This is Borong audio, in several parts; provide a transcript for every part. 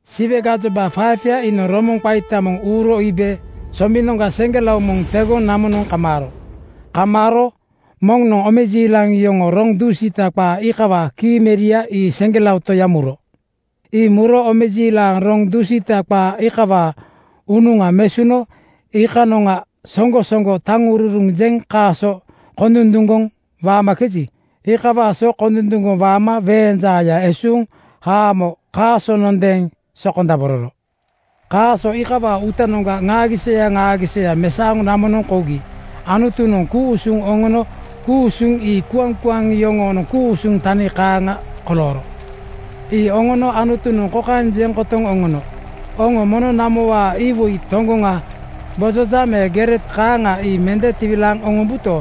Siwe gajoba 5:ya iinoŋ romoŋa qaita moŋ (biugel) uuro iibe sombinoŋga seŋgelao moŋ tegoŋ namonoŋ kamaaro. Kamaaro moŋnoŋ omejiilaŋ yoŋoo roŋ dusiita qaa iikawaa kii meria ii seŋgelao Toya muro. Ii muro omejiilaŋ roŋ dusiita qaa iikawaa unuŋa mesuno iikanoŋa soŋgo soŋgo taŋururuŋ jeŋ kaaso kondunduŋgoŋ waamakeji, iikawaa so kondunduŋgoŋ waama weeŋ jaaya esuuŋ haamo kaasonondeeŋ sokondabororo. Kaaso iikawaa uutanoŋga ŋaagisoya ŋaagisoya mesaoŋ namonoŋ kougi Anutunoŋ ku-usuŋ oŋono. Ku-usuŋ ii kuaŋkuaŋ yoŋoonoŋ ku-usuŋ tani kaaŋa kolooro. Ii oŋono Anutunoŋ kokaeŋ jeŋ kotoŋ oŋono, “Oŋo mono namowaa iwoi toŋgoŋa gbojoja me gere kaaŋa ii mende tiwilaaŋ oŋombuto,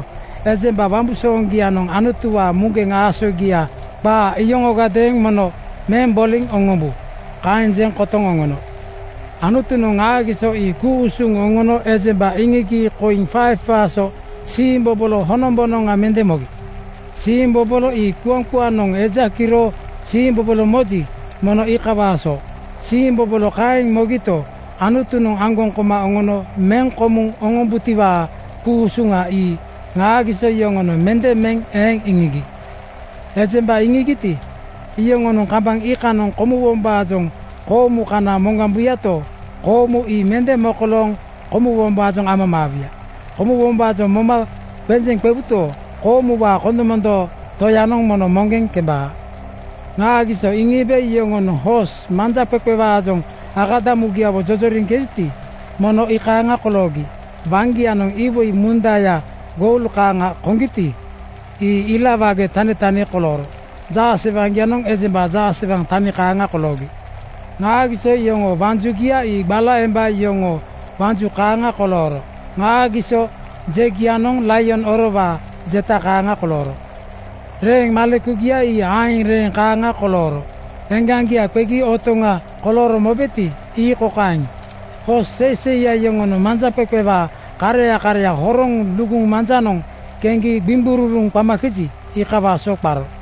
ejemba wambusooŋgianoŋ Anutuwaa muŋgeŋ aasogia qaa iyoŋogadeeŋ mono meŋ boliŋ oŋombu.” Kaeŋ jeŋ kotoŋ oŋono. Anutunoŋ ŋaagiso ii ku-usuŋ oŋono ejemba iŋigi koiŋ 5:waa so siimbobolo honombonoŋa mende mogi. Siimbobolo ii kuaŋkuanoŋ eja kiro siimbobolo moji, mono iikawaa so. Siimbobolo kaeŋ mogito, Anutunoŋ aŋgoŋ koma oŋono meŋ komuŋ oŋombutiwaa ku-usuŋa ii ŋaagiso yoŋonoŋ mende meŋ eeŋ iŋigi. Ejemba iŋigiti, iyoŋonoŋ kambaŋ iikanoŋ komuwombaajoŋ koomu kana moŋgambuyato, koomu ii mende mokolooŋ komuwombaajoŋ amamaawu. Komuwombaajoŋ moma qenjeŋ qewuto, koomuwaa kondomondoo Toyanoŋ mono moŋgeŋ kembaa. Ŋaagiso iŋiibe yoŋonoŋ hoos manjaqeqewaajoŋ akadamugiawo jojoriŋkejuti, mono ii kaaŋa koloogi. Waŋgianoŋ iwoi mundaya goul kaaŋa koŋgiti, ii ila wage tanitani kolooro. Jaasewaŋgianoŋ ejemba jaasewaŋ tani kaaŋa koloogi. Ŋaagiso yoŋoo waŋ jugia ii gbala emba yoŋoo wanju kaaŋa kolooro. Ŋaagiso jegianoŋ laion orowaa jeta kaaŋa kolooro. Reeŋ malekugia ii aeŋ reeŋ kaaŋa kolooro. Eŋgaŋgia qegi otoŋ kolooro mobeti, ii kokaeŋ: Hoos seiseiya yoŋonoŋ manjaqeqewaa kareya kareya horoŋ luguŋ manjanoŋ keŋgi gbiŋgururuŋ qamakeji, iikawaa so qaro.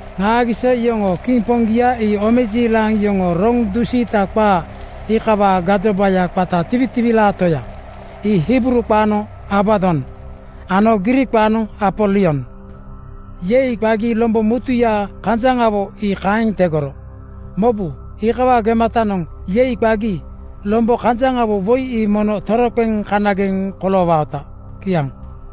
Ŋaagiso yoŋoo kiŋ poŋgia ii omejiilaŋ yoŋoo roŋ dusiita qaa iikawaa gajobaya qata Tiwitiwilaa Toya. Ii Hibruu qaanoŋ Abadon ano Griik qaanoŋ Apolion. ‘Yei!’ qagi lombo mutuya kanjaŋawo ii kaeŋ tegoro. Mobu, iikawaa gematanoŋ ‘Yei!’ qagi lombo kanjaŋgarawo woi ii mono toroqeŋ kanageŋ koloowaota. Kiaŋ.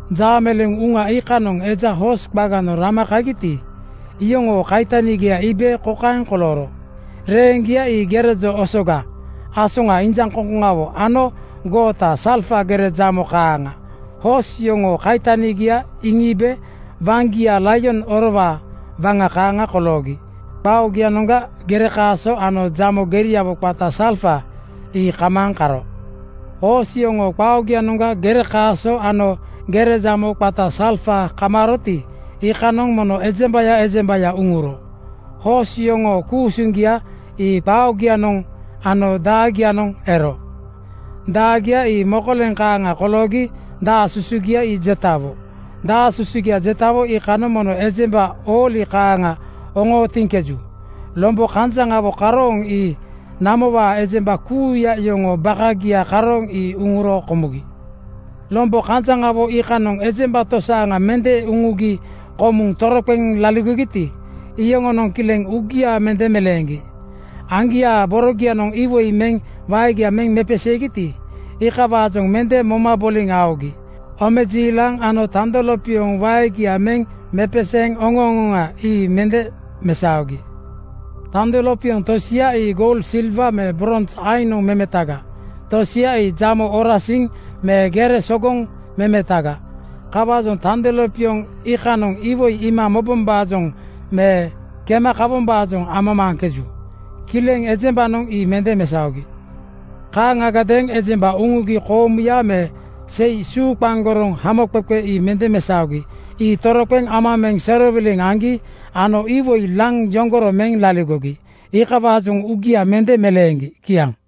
Jaameleeŋ uŋa iikanoŋ eja hoos qaganoŋ rama kagiti, iyoŋoo kaitanigia iibe kokaeŋ kolooro: Reeŋgia (totowaa aeŋ reeŋgia) ii gere jo osoga, asoŋa injaŋkoŋkoŋawo ano goota salfa gere jamo kaaŋa. Hoos yoŋoo kaitanigia iŋiibe waŋgia laion orowaa waŋa kaaŋa koloogi qaa oogianoŋga gere, kaaso ano jamo geriawo qata salfa ii kamaaŋ karo. Hoos yoŋoo qaa oogianoŋga gere, kaaso ano gere jamo qata salfa kamaaroti, iikanoŋ mono ejembaya ejembaya uŋuro. Hoos yoŋoo ku-usuŋgia ii qaa oogianoŋ ano daagianoŋ ero. Daagia ii mokoleŋ kaaŋa koloogi daa susugia ii jetawo. Daa susugia jetawo iikanoŋ mono ejemba ooli kaaŋa oŋootiŋkeju. Lombo kanjaŋawo karooŋ ii namowaa ejemba kuuya yoŋoo bakagia karooŋ ii uŋuro komugi. Lombo kanjaŋawo iikanoŋ ejemba tosaaŋa mende uŋugi komuŋ toroqeŋ laligogiti, iyoŋonoŋ kileŋ uugia mende meleeŋgi. Aŋgiaa borogianoŋ iwoi meŋ waegia meŋ mepeseegiti, iikawaajoŋ mende moma boliŋ aogi. Omejiilaŋ ano tando lopioŋ waegia meŋ mepeseeŋ oŋo-oŋoŋa ii mende mesaogi. Tando lopioŋ tosia ii goul, silwa me brons aiŋnoŋ memetaga. Tosia ii jamo orasiŋ me gere sogoŋ memetaga. Kawaajoŋ tando lopioŋ iikanoŋ iwoi iima mobombaajoŋ me kema kawombaajoŋ amamaaŋkeju. Kileŋ ejembanoŋ ii mende mesaogi. Kaaŋagadeeŋ ejemba uŋugi koomuya me sei suuqaŋgoroŋ hamoqeqe ii mende mesaogi. Ii toroqeŋ ama meŋ serowiliŋ aŋgi ano iwoi laŋ yoŋgoro meŋ laligogi. Iikawaajoŋ uugia mende meleeŋgi. Kiaŋ.